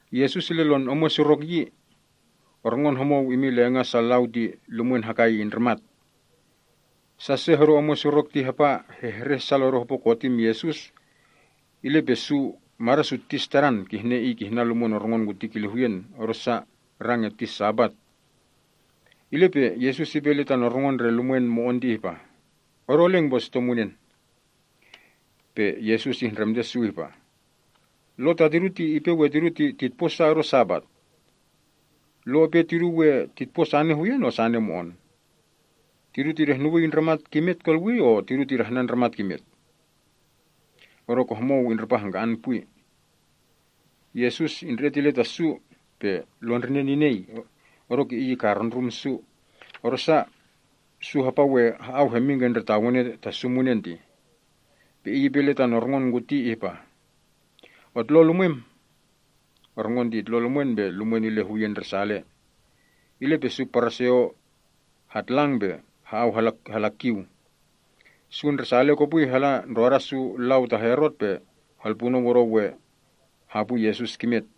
Yesus ile lon omwen surok yi. Orngon homou imin lenga’ sa lau ti lumwen hakai indrimat. Sa se hodo omwen surok ti hapa hehreh sal odo hopo kotim Yesus, ile pe su mada’ su tis Tadan, kihne Iy kihnan lumwen orngon kuti kile huyen, odosa rang erti Sabat. Ile pe Yesus ipe ile tan orngon ndre lumwen mo‑on ti ihpa, “Odo eleng pe esuto munen.” Pe Yesus ihndremte su ihpa, “Lo tatidu ti ipe we tidu titpo sa kidu Sabat? Lo ipe tidu we titpo sane huyen or sane mo‑on? Tidu tidehnuwii ndramat kimet kolwii, or tidu tidahnan ndramat kimet?” Odoke homou indripa hangka‑an pwi. Yesus indre‑et ile ta su pe lon ndrinen inei, odoke ikarundrum su, odosa su hapa we ha‑au hemin ke ndre tawene ta su munen tih. Pe Iy ipe ile tan orngon kuti ihpa, “Otlon lumwem.” Orngon ti itlon lumwen pe lumwen ile huyen ndresale. Ile pe su Paraseo hatlang pe ha‑au hala kiu. Su ndresale kopwi hala ndroda su lau ta Herot pe helpunou odo we hapwi Yesus kimet.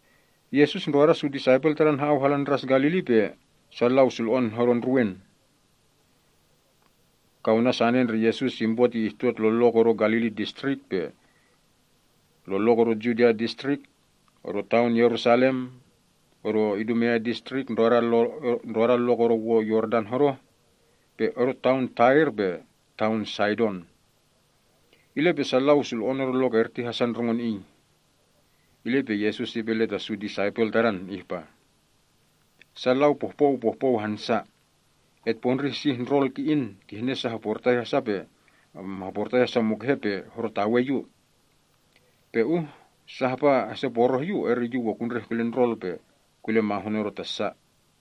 Yesus ndroda su disaipel Tadan ha‑au hala Ndras Galili pe sa lau sulo‑on hodo ndruwen. Kaunan sane ndre Yesus impo ti ihtot lon lok odo Galili Distrik, Judea Distrik, odo taon Yerusalem, odo Idumea Distrik ndroda lok odo wo Yordan hodoh, pe odo taon Tair pe taon Saidon. Ile pe sa lau sulo‑on odo lok erti hasa ndrongon Iy. Ile pe Yesus ipe ile ta su disaipel Tadan ihpa, “Sa lau pohpou pohpou hansa. Etpondrih sih ndrol ki‑in, kihne sa hoportai hasa mukehe pe horotawe Yu. Pe uh sa hapa heseporoh Yu, eri Yu we kundreh kile ndrol pe kule mahun odo ta sa.”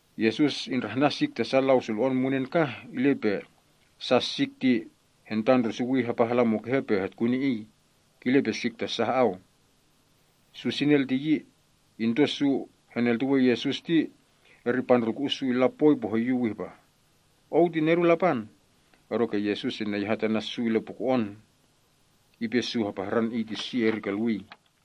Yesus indrahnan sik ta sa lau sulo‑on munen kah, ile pe sa sik ti hentandrusuwi hapa hala mukehe pe hetkuni Iy, kile pe sik ta sa ha‑au. Su sinel ti yi, into su heneltuwe Yesus, eri pandrulku‑u’ su illa poi pe hoyuw ihpa, “Ou ti Nedun Lapan!” Odoke Yesus ineyahat ana’ su ile puko‑on, ipe su hapahran Iy ti si eri kolwii.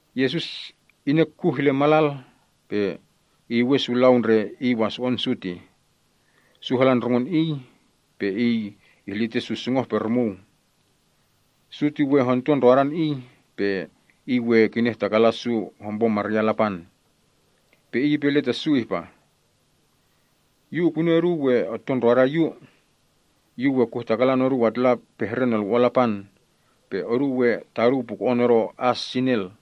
Yesus inek kuh ile malal, pe iyuwen su lau ndre Iy waso‑on su tih. Su hala ndrongon Iy, pe Iy ihlite su sungoh-pe-rumuu. Su ti we honto ndrodan Iy, pe Iy we kinehtakalan su hompo maryan Lapan. Pe Iy ipe ile ta su ihpah, “Yu ukuni oduu we otto ndroda Yu. Yu we kuhtakalan oduu atlapehre Nolwo‑on Lapan. Pe oduu we taduu puko‑on odo as sinel.”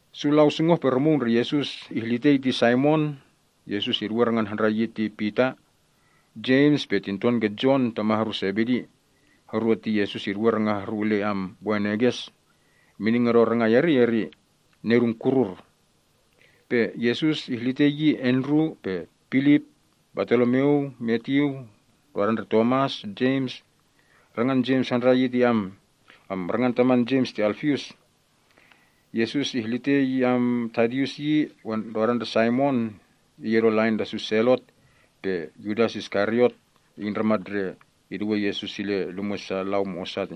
Su lau sungoh-pe-rumuu ndre Yesus ihlitei ti Saimon (Yesus iduwe rangan handrai yi ti Pita), Jems pe tinton ke Jon, tama’ horu Sebedi (Yesus iduwe ranga’ horu ile Boanerges. Mining odo rangai erti ihpa ndre ‘Nedun Kurur’). Pe Yesus ihlite yi Andru, Filip, Bartolomyu, Matyu, Tomas, Jems (rangan taman Jems ti Alfius). Yesus ihlite yi Tadius, Saimon (iy odo lain ta su Selot), pe Yudas Iskariot, iy ndramat ndre iduwe Yesus ile lumwe’ sa lau mo‑osa.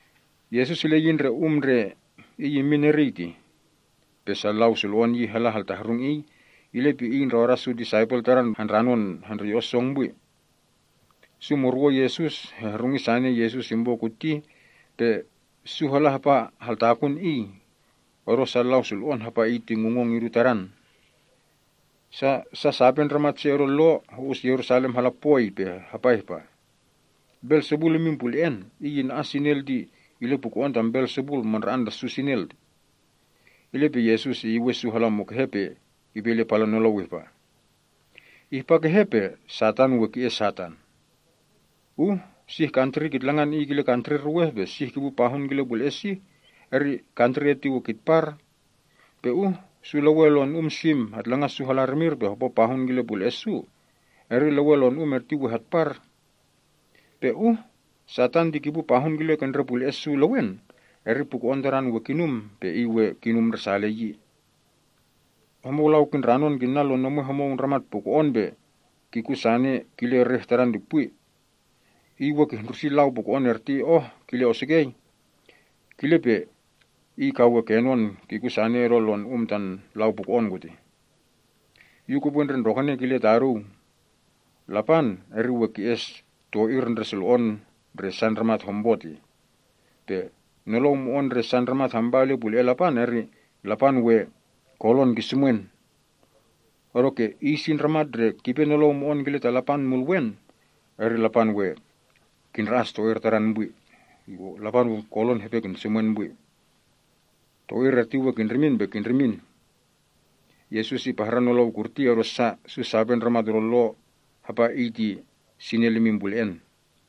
Yesus ile yi ndre um ndre iy immin eriy tih. Pe sa lau sulo‑on yi hala haltahrung Iy, ile pe Iy ndroda su disaipel Tadan handranon hendreyo‑on song pwi. Su murwon Yesus hehrungi sane Yesus impo kuti, pe su hala hapa haltakun Iy, odo sa sulo‑on hapa Iy ti ngungong idu Tadan. Sa sape ndramat se odo Lo ho‑us Yerusalem hala pwoi, pe hapa ihpa, “Belsebul imin pule‑en. Iy ina‑as sa sinel ti ile puko‑on tam Belsebul, mandra‑an ta su sinel.” Ile pe Yesus iyuwen su hala mukehe pe ipe ile palan nolou ihpa, “Ihpa kehe pe Satan we ki‑es Satan? Uh sih kantri kitlangan iy kile kantri ruweh, pe sih kipu pahun kile pule‑en sih, eri kantri erti we kitpar. Pe uh su lewen lonu‑um sim hetlangan su hala rimir pe hopo pahun kile ke ndre pule‑e’ su, eri lewen lon um erti we hatpar. Pe uh Satan kipu pahun kile ke ndre pule‑e’ su lewen, eri puko‑on tadan we kinum, pe iy we kinum ndresale.” “Homou lau kindranon kinna lon omwen homou ndramat puko‑on pe kikun sane kile reh tadan ti pwi. Iy we kihndrusi lau puko‑on erti kile osukei oh, kile pe iy ka we kenon kikun sane odo lon um ta lau puko‑on kutih.” “Yu kupwe ndre ndrokene kile taduu. Lapan we ki‑es to‑ir ndre sulo‑on ndre sa ndramat hompo. Pe nolou mo‑on ndre sa ndramat hampa ile pule‑en Lapan, eri Lapan we ki‑es ke‑eu, odoke iy si ndramat ndre kipe nolou mo‑on kile ta Lapan Mulwen, eri Lapan we kindra‑as to‑ir tadan erti pwi. To‑ir erti we kindrimin pe kindrimin.” Yesus ipahran nolou kurti, odosa su sape ndramat odo Lo hapa sinel imin pule‑en.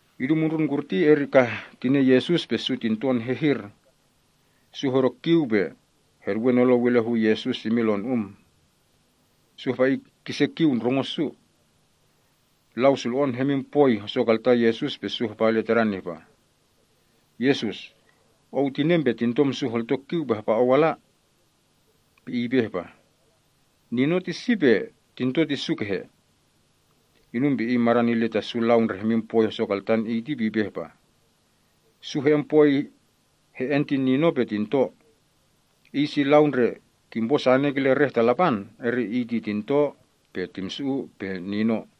Idu mundrun kurti, eri kah tinen Yesus pe su tinton hehir. Su hodo kiu pe heduwe nolou ile hu Yesus imin lon um. Su hapa Iy kise kiu ndrongo’ su. Lau sulo‑on hemin pwoi hosokaltan Yesus, pe su hapa ile Tadan ihpa, “Yesus, tinem pe tintom su holto kiu pe hapa Ou ala.” Pe Iy ipe ihpa, “Nino ti iy si, pe tinto ti su kehe?” Inum pe Iy madan ile ta sa lau ndre hemin pwoi hosokaltan Iy ti pe ipe ihpah, “Su he‑en poi he‑en ti nino pe tinto. Iy si ndre kimpo sane kile reh ta Lapan, eri iy ti tinto pe timsu‑u pe nino.”